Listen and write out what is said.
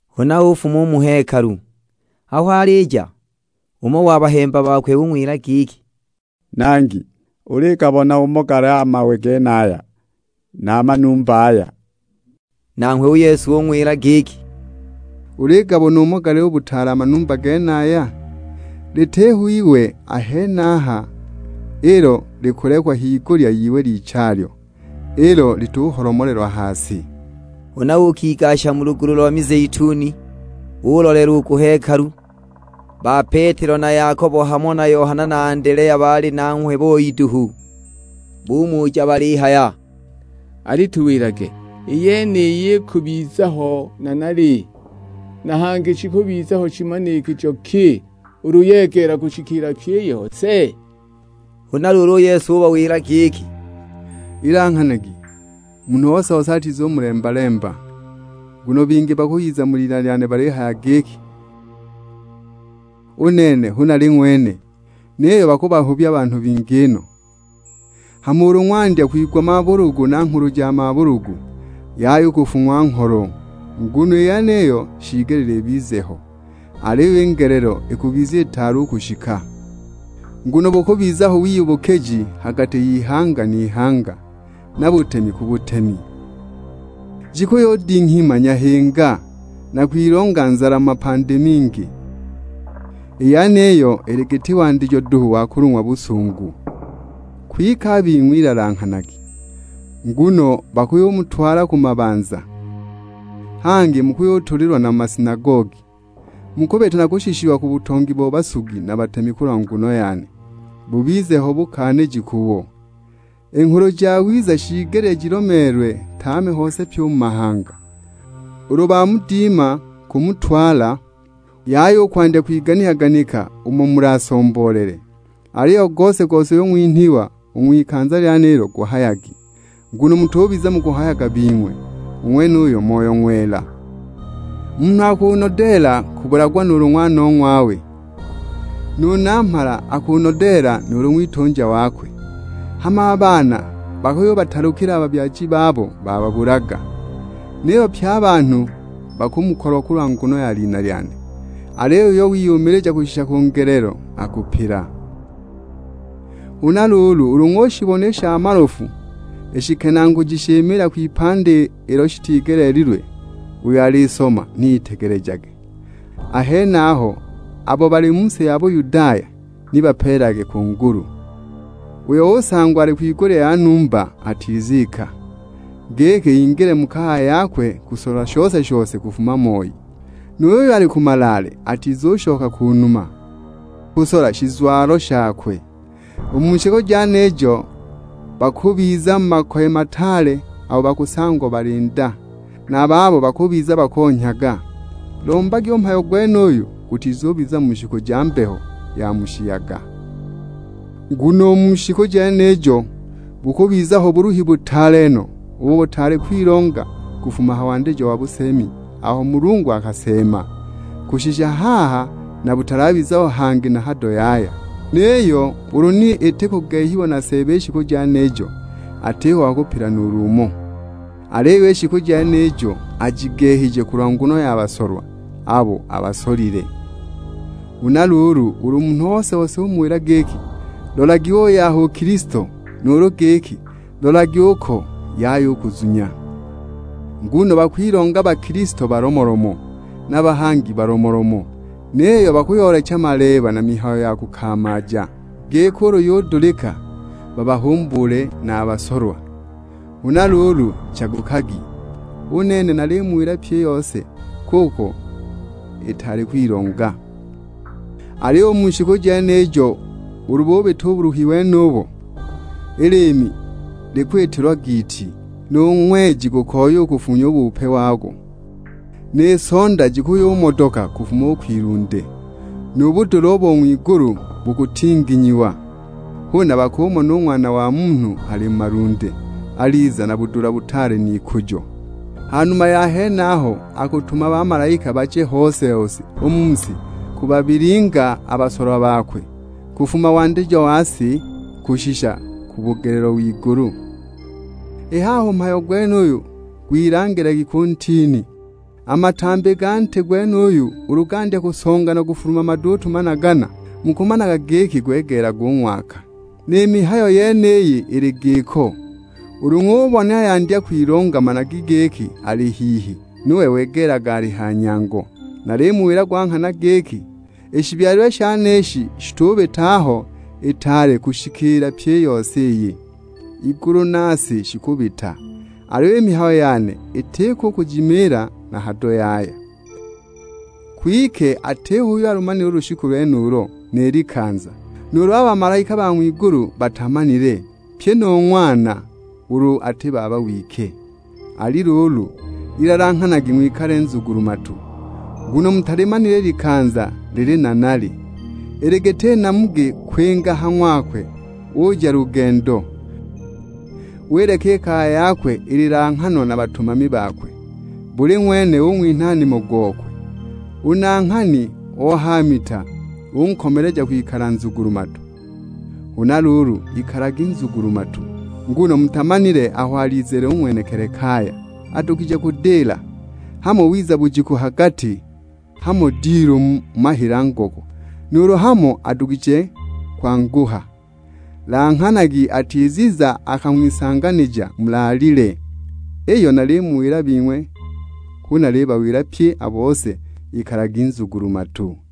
Huna ufuma u mu hekalu, aho alija, umo wa bahemba bakwe ung'wila giki, "Nangi, uligabona umo gali a mawe genaya na a manumba aya!" Nanghwe u Yesu ung'wila giki, "Uligabona umo gali u butaale a manumba genaya? Litiho iwe a henaha ilo likulekwa higulya y'iwe lichalyo, ilo lituholomolelwa ha si!" Huna uukigasha mu lugulu lo mizeituni, ulolela u ku hekalu, ba Petelo na Yakobo hamo na Yohana na Andelea baali nanghwe boi duhu; bumuja balihaya, "Alituwilage, i yeniyi ikubiza ho nanali, na hangi shikubiza ho shimanikijo ki ulu yegeela kushikiila pyi i yose?" Huna luulu u Yesu ubawila giki, "Ilanghanagi, munhu ose-ose atizumulemba-lemba. Nguno bingi bakuyiza mu lina lyane balihaya giki, 'U nene hu nali ng'wene!' Niyo bakuhubya banhu bingi no. Hama ulu ng'wandya kwigwa mabulugu na nghulu ja mabulugu, yaya u kufung'wa ngholo, nguno i yeniyo shiigelile ibize ho; aliyo i ngelelo ikubiza itaali u kushika. Nguno bukubiza ho wiyubukiji ha gati y'ihanga n'ihanga, na butemi ku butemi. Jikuyudinghima nyahinga, na kwilonga nzala mu mapandi mingi. I yeniyi ili giti wandijo duhu wa kulung'wa busungu." "Kwike a bing'we ilanghanagi, nguno bakuyumutwala ku mabanza, hangi mukuyutulilwa na mu masinagogi. Mukubita na kushishiwa ku butongi bo basugi na batemi kulwa nguno yane, bubize ho bukaaniji kubo. I Nghulu Jawiza shiigelile jilomeelwe tame hose pyi u mu mahanga. Ulu bamudima kumutwala, yaya u kwandya kwiganika-ganika umo mulasomboolele, aliyo gose-gose uyo ng'winhwa u ng'wikanza lyenilo guhayagi. Nguno mutubiza mukuhayaga bing'we; u ng'wenuyo Moyo Ng'wela. Munhu akunodeela kubulagwa nuulu ng'wanong'wawe, nu namhala akunodeela nuulu ng'witunja wakwe. Hama a baana bakuyubatalukila a babyaji babo bababulaga! Niyo pye a banhu bakumukolwa kulwa nguno ya lina lyane; aliyo uyo wiyumilija kushisha ku ngelelo akupila." "Huna luulu ulu ng'ushibona i sha malofu i shikenaaguji shimiila h'ipandi ilo shitigeleelilwe, (uyo alisoma ni itegelejage), a henaho abo bali mu si ya Buyudaya, ni bapeelelage ku ngulu. Uyo usangwa ali kwigulya ya numba atizika, giki ingile mu kaya yakwe kusola shose-shose kufuma moi. Nu yuyo ali ku malaale atizushoka ku numa, kusola shizwalo shakwe. U mu shiku jenijo, bakubiza mu makoye mataale no abo bakusangwa bali nda, na a babo bakubiza bakonhyaga. Lombagi u mhayo gwenuyo gutizubiza mu shiku ja mbeho ya mu shiyaga. Nguno u mu shiku jenijo, bukubiza ho buluhi butaale no, ubo butaali kwilonga kufuma ha wandijo wa buseemi aho Mulungu akaseema, kushisha haha, na butalabiza ho hangi na hado yaya! Niyo ulu ni iti kugehiwa na Seeba i shiku jenijo, atiho wa kupila nuulu umo. Aliyo i shiku jenijo, ajigehije kulwa nguno ya basolwa, abo abasolile." "Huna luulu ulu munhu ose-ose umuwila giki, 'Lolagi uuy'aha u Kilisto,' nuulu giki, 'Lolagi uko,' yaya u kuzunya. Nguno bakwilonga bakilisto balomolomo, na bahangi balomolomo; niyo bakuyoolecha maleeba na mihayo ya kukamaaja, giki ulu yudulika, babahumbuule na a basolwa. Huna luulu chagukagi, u nene namuwilaga pyi i yose kuko itaali kwilonga." "Aliyo u mu shiku jenijo ulu bubita u buluhi wenubo, i liimi likwitilwa giiti, nu ng'weji gukoya ukufunya u bupe wago. Ni sonda jikuyumodoka kufuma u kwilunde, nu budula bo ng'wigulu bukutinginyiwa. Huna bakumona u Ng'wana wa Munhu ali mu malunde, aliza na budula butaale n'ikujo. Ha numa ya henaho akutuma bamalaika baje hose-hose u mu si bakubabilingaga a basolwa bakwe, kufuma wandijo wa si kushisha ku bugelelo w'igulu." "I haha u mhayo gwenuyu gwilangilagi ku ntini. A matambi ga nti gwenuyo ulu gandya kusonga na kufuluma maduutu managana, mukamanaga giki gwegeelaga u ng'waka. Ni mihayo yeniyi ili giko. Ulu ng'ubona yandya kwilonga managi giki, ali hihi, nuwe wegeelaga ali ha nyango. Nalimuwila gwa nghana giki, i shibyalilwe ishi shitubita aho itaali kushikiila pyi i yose iyi. I ligulu ni si shikubita, aliyo i mihayo yane itiko kujimiila na hado yaya!" "Kwike atiho uyo alumanile u lushiku lwenulo, ni likanza; nuulu a bamalaika ba ng'wigulu batamanile, pyi nu Ng'wana, ulu ati Baba wike. Ali luulu, ilanghanagi ng'wikale nzugulu-matu, nguno mutalimanile i likanza lili nanali. Ili giti namugi kwinga ha ng'wakwe uja lugendo, wileka i kaya yakwe ililanghanwa na batumami bakwe, buli ng'wene ung'winha nimo gokwe. U nanghani o ha mita unkomeleja kwikala nzugulu-matu! Huna luulu ikalagi nzugulu-matu, nguno mutamanile aho alizile u ng'wenekili kaya. Adugije kudila, hamo wiza bujiku ha gati, hamo dilu mu mahila ngoko, nuulu hamo adugije kwanguha. Langhanagi atiziza akang'wisanganija mulaalile. Iyo nalimuwila bing'we hu nalibawila pye a bose, ikalagi nzugulu-matu!"